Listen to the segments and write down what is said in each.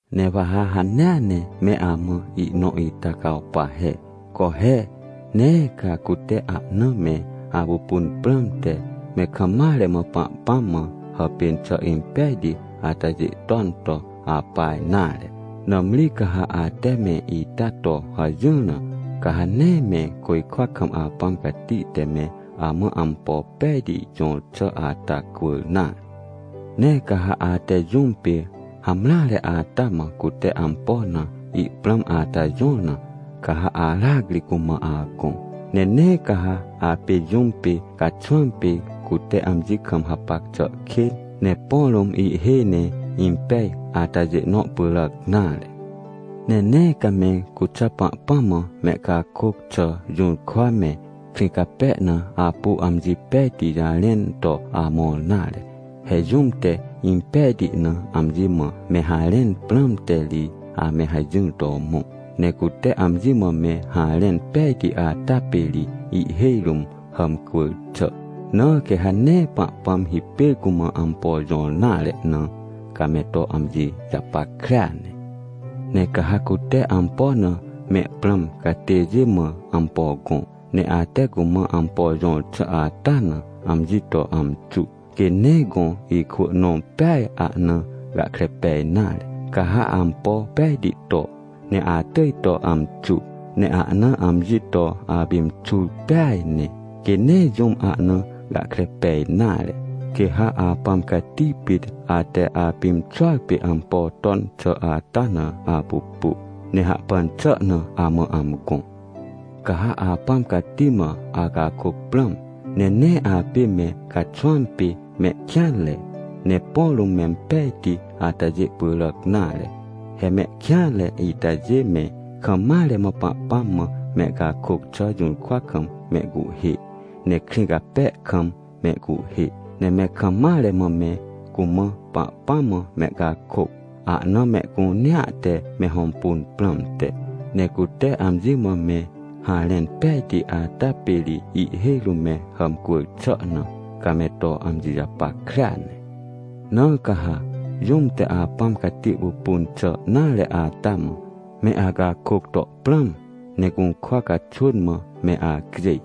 — Ne wa ha hanea ne me amã ihnõ ita cawpa he. Co he! Nee ca cute ahna me apupun prãmte me kam mare mã Pahpãm mã hàpên xà impejti atajê ton to apa nare. Nãmri ca ha ate me ita to hajỹr na, ca ha nee me côjkwa kam Apãm Cati te me amã ampo pejti jõr xà ata cwỳr nare. — Ne ca ha ate jũm pê hamreare ata mã cute ampo na ihprãm ata jõr na, ca ha aracri cumã agõ. Ne nee ca ha apê jũm pê caxwãm pê cute amji kam hapac xà kên, ne põ rũm ihhêj ne impej atajê nõ pyràc nare. Ne nee ca me cuxà Pahpãm mã mehcakôc xà jũrkwa me, krĩ cape na apu amji pejti jarẽn to amõr nare. He jũm te impejti na amji mã me harẽn prãmte ri, ame hajỹr to mõ. Ne cute amji mã me harẽn pejti ata pê ri ihhêj rũm hàmcwỳr xà. Na quê ha nee Pahpãm hipêr cumã ampo jõr nare na, ca me to amji japackrea ne. — Ne ca ha cute ampo na me prãm catêjê mã ampo gõ, ne ate cumã ampo jõr xà ata na amji to amxu, quê nee gõ ikwỳ nõ peaj ahna gahkre pej nare. Ca ha ampo pejti to, ne atỳj to amxu, ne ahna amji to apimxur peaj ne, quê nee jũm ahna gahkre pej nare, quê ha Apãm Cati pit ate apimxuar pê ampo ton xà ata na apupu, ne hahpan xà na amã amgõ. — Ca ha Apãm Cati mã acakôc prãm, ne nee apê me caxwãm pê mehkêanre, ne põ rũm mempejti atajê pyràc nare. He mehkêanre itajê me kam mare mã Pahpãm mã mehcakôc xà jũrkwa kam mehcuhhê, ne krĩ cape kam mehcuhhê, ne me kam mare mã me cumã Pahpãm mã mehcakôc, ahna mehcunea te me hõmpun prãmte. Ne cute amji mã me harẽn pejti ata pê ri ihhêj rũm me hàmcwỳr xà na, ca me to amji japackrea ne. Na ca ha, jũm te Apãm Cati pupun xà nare ata mã, me acakôc to prãm, ne gũrkwa caxwỳn mã me acjêj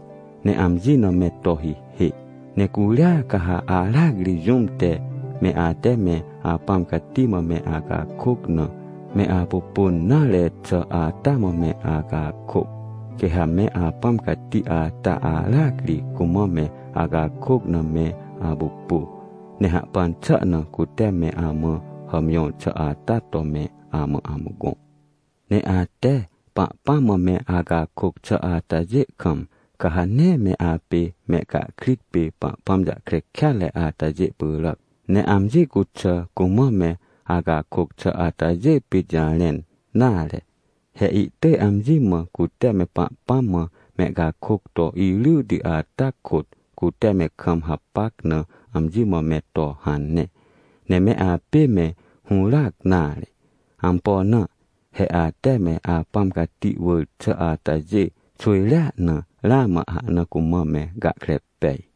ne amji na me to hihê. Ne curia ca ha aracri jũm te, me ate me Apãm Cati mã me acakôc na, me apupun nare xà ata mã me acakôc. Quê ha me Apãm Cati ata aracri cumã me acakôc na me apupu, ne hahpan xà na cute me amã hàmjõr xà ata to me amã amgõ. — Ne ate Pahpãm mã me acakôc xà atajê kam, ca ha nee me apê mehcahkrit pê Pahpãm jahkre kêatre atajê pyràc, ne amji cuxà cumã me acakôc xà atajê pit jarẽn nare. He ihtỳj amji mã cute me Pahpãm mã mehcakôc to iryti ata kôt, cute me kam hapac na amji mã me to hane. Ne me apê me hũràc nare. Ampo na? He ate me Apãm Cati wỳr xà atajê xwỳjrea na, ramã ahna cumã me gahkre pej.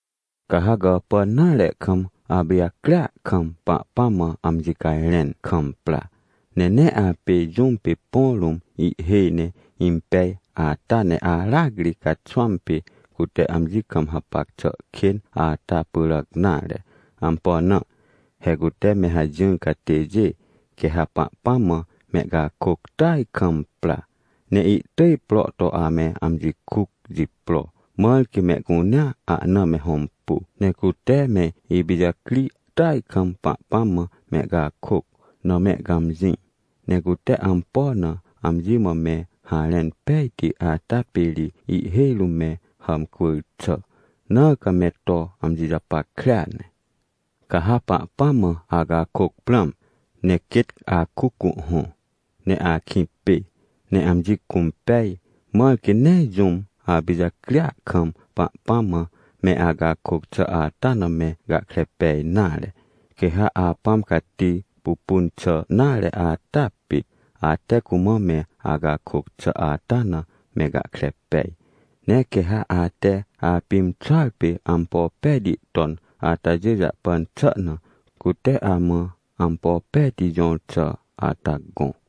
— Ca ha gàpàn nare kam apijacria kam, Pahpãm mã amji cajrẽn kam pra, ne nee apê jũm pê põ rũm ihhêj ne impej ata ne aracri caxwãm pê cute amji kam hapac xà kên ata pyràc nare. Ampo na? He cute me hajỹr catêjê quê ha Pahpãm mã mehcakôc tỳaj kam pra, ne ihtỳj pro to ame amji kuc jipro, mãr quê mehcunea ahna me hõmpu, ne cute me ipijacri tỳaj kam Pahpãm mã mehcakôc na mehcãmjĩ. Ne cute ampo na amji mã me harẽn pejti ata pê ri ihhêj rũm me hàmcwỳr xà. Na ca me to amji japackrea ne. Ca ha Pahpãm mã acakôc prãm, ne quêt akuc cuhhõ, ne akĩ pê, ne amji cũmpej, mãr quê nee jũm apijacria kam Pahpãm mã me acakôc xà ata na me gahkre pej nare. Quê ha Apãm Cati pupun xà nare ata pit, ate cumã me acakôc xà ata na me gahkre pej. Ne quê ha ate apimxuar pê ampo pejti ton atajê jahpan xà na, cute amã ampo pejti jõr xà ata gõ.